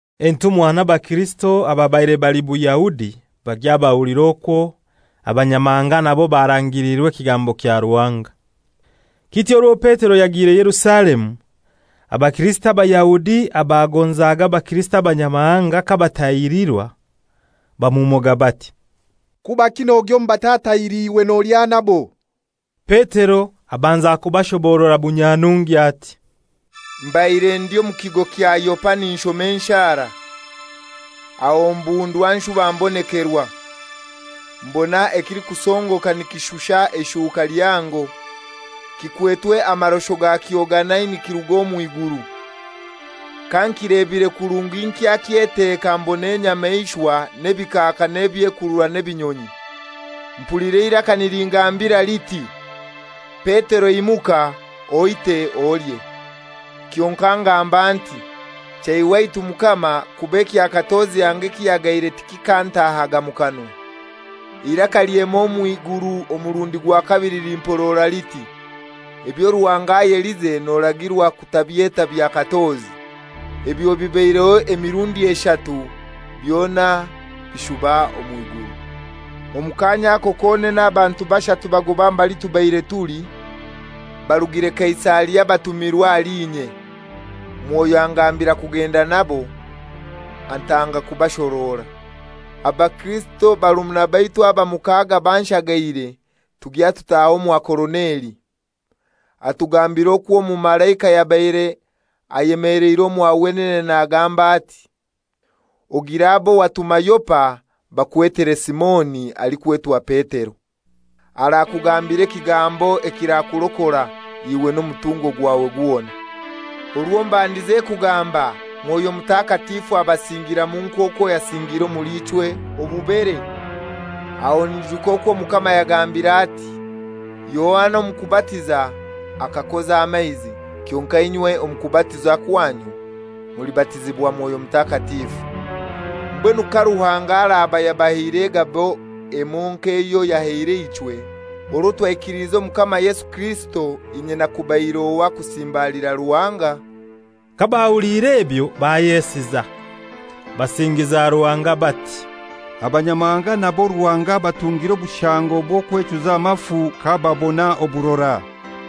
Entumwa n'abakirisito ababaire bali Buyahudi bagya bahulira okwo Abanyamahanga nabo barangiirwe ekigambo kya Ruhanga. Kityo orwo Petero yagiire Yerusalemu, Abakirisito Abayahudi abagonzaga Abakirisito abanyamahanga kabatahirirwa, bamumoga bati, «Kubaki nogya omu batatahiriirwe nolya nabo?» Petero abanza kubashoboorora bunyanungi ati, «Mbaire ndi omu kigo kya Yopa ninshoma enshara. Aho mbundwa nshuba mbonekerwa, mbona ekilikusongoka nikishusha eishuka lihango, kikwetwe amarosho gakyo ganai nikiruga omw'iguru. Kankilebire kurungi nkyakyeteka mbona enyamaishwa n'ebikaaka n'ebyekurura n'ebinyonyi. Mpulira eiraka nilingambira liti, ‹Petero imuka, oite olye.› Kyonkai ngamba nti, ‹Chei waitu Mukama, kuba ekya katozi anga ekihagaire tikikantahaga mu kanwa.› Eiraka lyema omw'iguru omurundi gwa kabili limporora liti, ‹Ebyo Ruhanga ayelize noragirwa kutabyeta bya katozi.› Ebyo bibaireho emirundi eshatu, byona bishuba omw'iguru. Omu kaanya ako konene abantu bashatu bagoba mbali tubaire tuli, barugire Kaisaria batumirwe ahali inye. Mwoyo angambira kugenda nabo, antanga kubashorora. Abakirisito barumuna baitu aba mukaaga banshagaire, tugya tutaha omwa Koroneli. Atugambira okwo omumalaika yabaire ayemeleire omwa wenene nagamba ati, ‹Ogire abo watuma Yopa bakwetere Simoni alikwetwa Petero. Arakugambira ekigambo ekirakurokora, iwe n'omutungo gwawe gwona.› Orwo mbandize kugamba, Mwoyo Mutakatifu abasingiramu nk'okwo yasingiire omuli ichwe obubere. Aho nyijuka okwo Omukama yagambire ati, ‹Yohana omu kubatiza akakoza amaizi, kyonkai inywe omu kubatizibwa kwanyu mulibatizibwa Mwoyo Mutakatifu.› Mbwenu ka Ruhanga araba yabahaire egabo emoi nk'eyo yahaire ichwe orwo twaikiliize Omukama Yesu Kirisito, inye nakubaire ohai kusimbalira Ruhanga?» Kabahuliire ebyo bayesiza. Basingiza Ruhanga bati, «Abanyamahanga nabo Ruhanga abatungire obushango bw'okwechuza amafu kababona oburora!»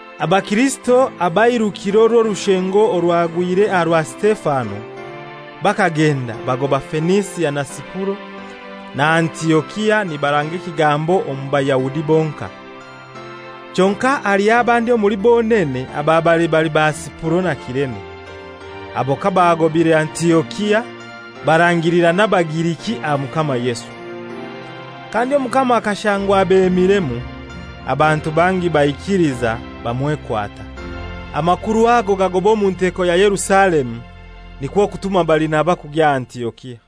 Abakirisito abairukiire orw'orushengo orwagwire aha rwa Sitefano bakagenda bagoba Fenisia na Sipuro na Antiokia nibaranga ekigambo omu Bayahudi bonkai. Kyonkai haliho abandi omuli bonene ababaire bali ba Sipuro na Kirene. Abo kabagobaire Antiokia barangira n'Abagiriki aha Mukama Yesu. Kandi Omukama akashangwa abemiremu, abantu bangi baikiliza bamwekwata. Amakuru ago gagoba omu nteko ya Yerusalemu, nikwo kutuma Barinaba kugya Antiokia.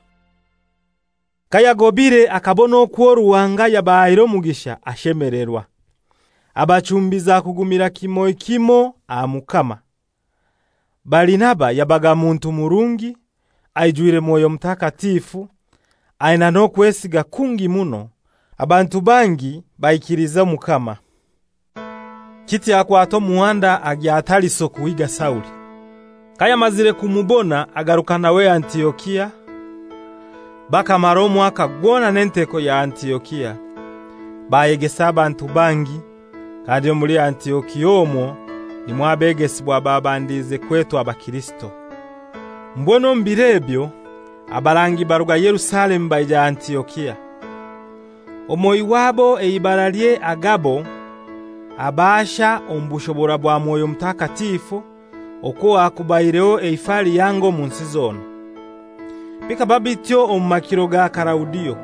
Kayagobaire akabona okwo Ruhanga yabahaire omugisha, ashemelerwa; abachumbiza kugumira kimoi kimoi aha Mukama. Barinaba yabaga muntu murungi, aijwire Mwoyo Mutakatifu, aina n'okwesiga kungi muno. Abantu bangi baolooza Omukama. Kityo akwata omuhanda agya Tariso kuhiiga Sauli. Kayamazire kumubona agaruka nawe Antiokia. Bakamara omwaka gwona n'enteko ya Antiokia, bayegesa abantu bangi; kandi omuli Antiokia omwo nimwo abegesibwa babandize kwetwa Bakirisito. Mbwenu omu biro ebyo abarangi baruga Yerusalemu baija Antiokia. Omoi wabo eibaralye Agabo abaasha omu bushobora bwa Mwoyo Mutakatifu okwo hakubaireho eifa lihango omu nsi zona. Bikaba bityo omu makiro ga Kalaudio.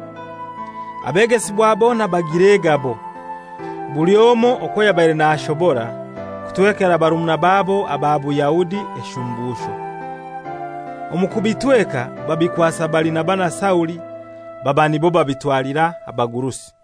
Abegesibwa bona bagira egabo, buli omoi okwo yabaire nashobora, kutwekera barumuna babo aba Buyahudi eshumbusho. Omu kubitweka babikwasaga Barinaba na Sauli baba nibo babitwalira abagurusi.